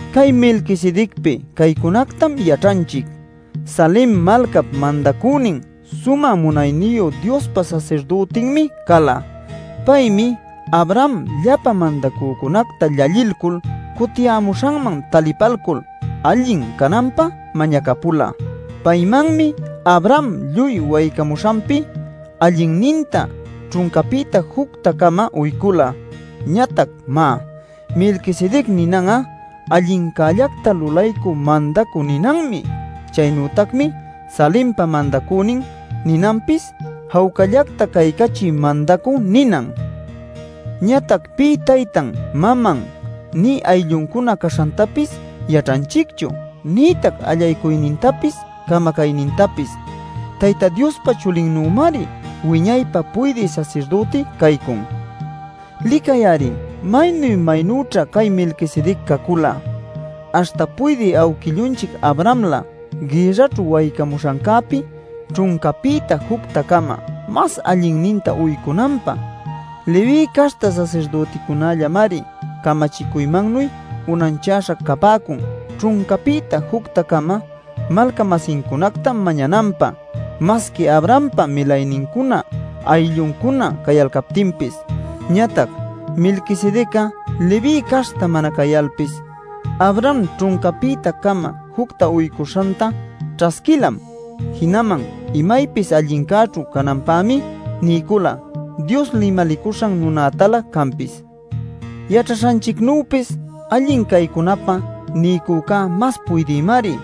Cay Melquisedecpi caycunactam yaćhanchic: Salem malcap mandacünin, Sumä Munayniyu Diospa sasirdütinmi cala. Paymi Abraham llapa mandacücunacta llallilcul cutiyämuśhanman talipalcul allin cananpä mañacapula. Paymanmi Abraham lluy waycamuśhanpi allinninta ćhuncapïta jucta-cama uycula. Ñatac, má, “Melquisedec” ninan'a “Allincällacta lulaycü mandacü” ninanmi. Chaynütacmi “Salempa mandacünin” ninanpis “Jawcallacta caycachï mandacü” ninan. Ñatac pï taytan maman nï aylluncuna caśhantapis yaćhanchicchu nïtac allaycuynintapis camacaynintapis. Tayta Diospa chulinnümari wiñaypä puydï sasirdüti caycun. Licay-ari maynu-maynüćha cay Melquisedec cacula, aśhta puydï awquillunchic Abrahamlä gïrraćhu waycamuśhancäpi ćhuncapïta jucta-cama mas allinninta uycunanpä. Leví caśhta sasirdüticunällamari camachicuymannuy unanchaśha capäcun ćhuncapïta jucta-cama malca-masincunacta mañananpä masqui Abrahampa milaynincuna aylluncuna cayalcaptinpis. Ñatac Melquisedec'a Leví caśhta mana cayalpis Abraham ćhuncapïta-cama jucta uycuśhanta ćhasquilam. Jinaman imaypis allincäćhu cananpämi niycula Dios limalicuśhan nunätalä canpis. Yaćhaśhanchicnüpis allin caycunapä niycücá mas puydïmari,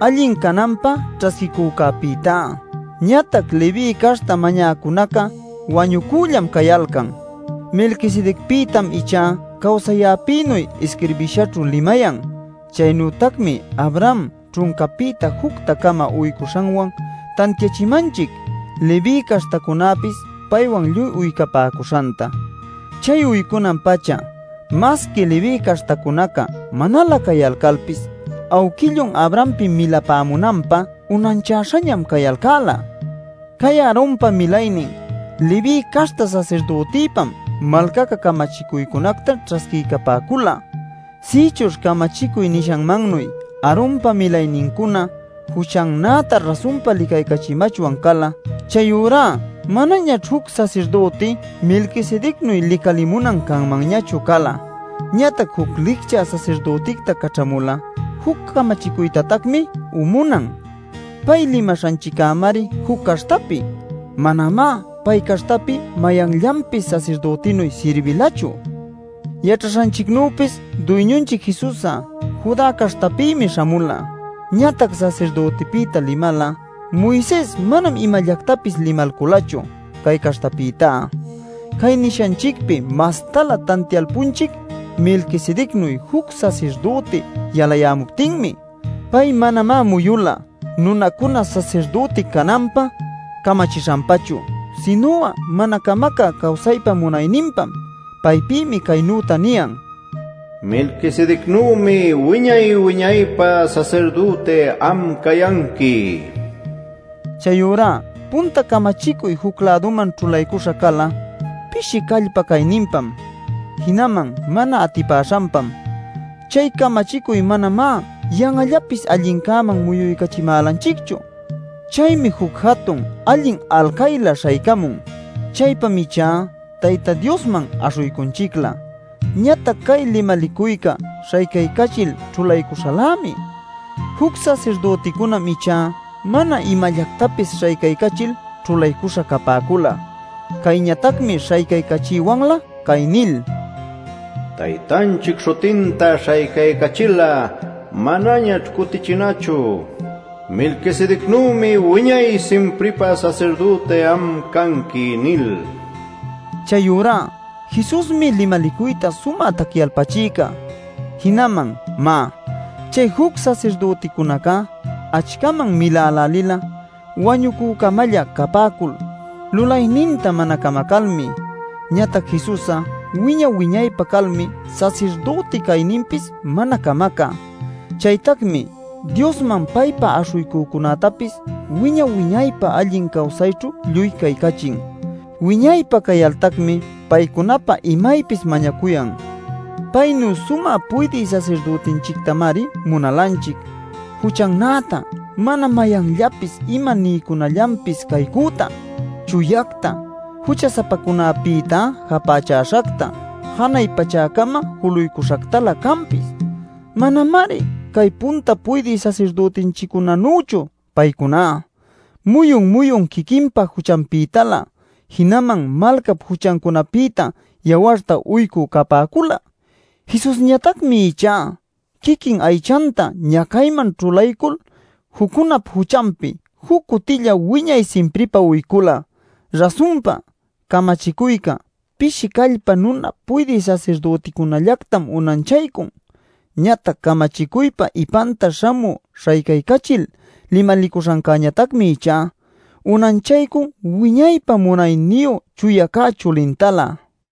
allin cananpä ćhasquicücäpïtá. Ñatac Leví caśhta mañäcunaca wañucüllam cayalcan. Melquisedecpïtam ichá cawsayäpïnuy isquirbishaćhu limayan. Chaynütacmi Abraham ćhuncapïta jucta-cama uycuśhanwan tantiachimanchic Leví caśhtacunapis paywan lluy uycapäcuśhanta. Chay uycunan-pacha masqui Leví caśhtacunaca manalä cayalcalpis awquillun Abrahampi milapämunanpä unanchäśhañam cayalcäla. Cay Aaronpa milaynin Leví caśhta sasirdütipam malcaca camachicuycunacta ćhasquiycapäcula. Sïchuśh camachicuy nishanmannuy Aaronpa milaynincuna juchannäta rasunpa licaycachimachwan cala, chayurá manañaćh juc sasirdüti Melquisedecnuy licalimunan canmanñachu cala. Ñatac juc licchä sasirdüticta caćhamul'a juc camachicuytatacmi umunan. Pay limaśhanchiccämari juc caśhtapi. Manamá pay caśhtapi mayanllanpis sasirdütinuy sirbilachu. Yaćhaśhanchicnüpis Duyñunchic Jesus'a Judá caśhtapïmi śhamula. Ñatac sasirdütipïta limal'a Moises manam imallactapis limalculachu cay caśhtapïta. Cay nishanchicpi mastalä tantialpunchic Melquisedecnuy juc sasirdüti yalamuptinmi. Pay manamá muyula nunacuna sasirdüti cananpä camachishanpachu, sinu'a mana camacä cawsaypa munayninpam. Paypïmi caynüta niyan: “Melquisedecnümi wiña-wiñaypä sasirdüti am cayanqui” nil. Chayurá punta camachicuy juc-läduman ćhulaycuśha cala pishi callpa cayninpam, jinaman mana atipäśhanpam. Chay camachicuy manamá yan'allapis allincäman muyuycachimälanchicchu. Chaymi juc jatun allin alcaylä śhaycamun; chaypam ichá Tayta Diosman aśhuycunchiclä. Ñatac cay limalicuycá śhaycaycachil ćhulaycuśhalämi. Juc sasirdüticunam ichá mana imallactapis śhaycaycachil ćhulaycuśha capäcula. Cayñatacmi śhaycaycachiywanlä, cay nil: “Taytanchic śhutinta śhaycaycayächil'a manañaćh cutichin'achu, ‘Melquisedecnümi wiñay-simpripä sasirdüti am canqui’ nil” niyan. Chayurá Jesusmi limalicuyta sumä tacyalpachïca. Jinaman, má, chay juc sasirdüticunacá achcaman milälälila wañucü-camälla capäcul lulayninta mana camacalmi. Ñatac Jesus'a wiña-wiñaypä calmi sasirdüti cayninpis mana camacä. Chaytacmi Diosman paypa aśhuycücunätapis wiña-wiñaypä allin cawsayćhu lluy caycachin; wiñaypä cayaltacmi paycunapä imaypis mañacuyan. Paynu sumä puydï sasirdütinchictamari munalanchic: juchannäta, mana mayanllapis ima niycunallanpis caycüta, chuyacta, jucha-sapacunapïta japächäśhacta, janay pachäcama juluycuśhactalä canpis. Manamari cay punta puydï sasirdütinchiccunanüchu. Paycuná muyun-muyun quiquinpa juchanpïtalä jinaman malcap juchancunapïta yawarta uycü capäcula. Jesusñatacmi ichá quiquin aychanta ñacaycäman ćhulaycul juccunap juchanpi juc cutilla wiñay-simpripa uycula. Rasunpa camachicuyca pishi callpa nuna puydï sasirdüticunallactam unanchaycun; ñatac camachicuypa ipanta śhamü śhaycaycachil limalicuśhancäñatacmi ichá unanchaycun wiñaypä munayniyu chuya cä chulintalä.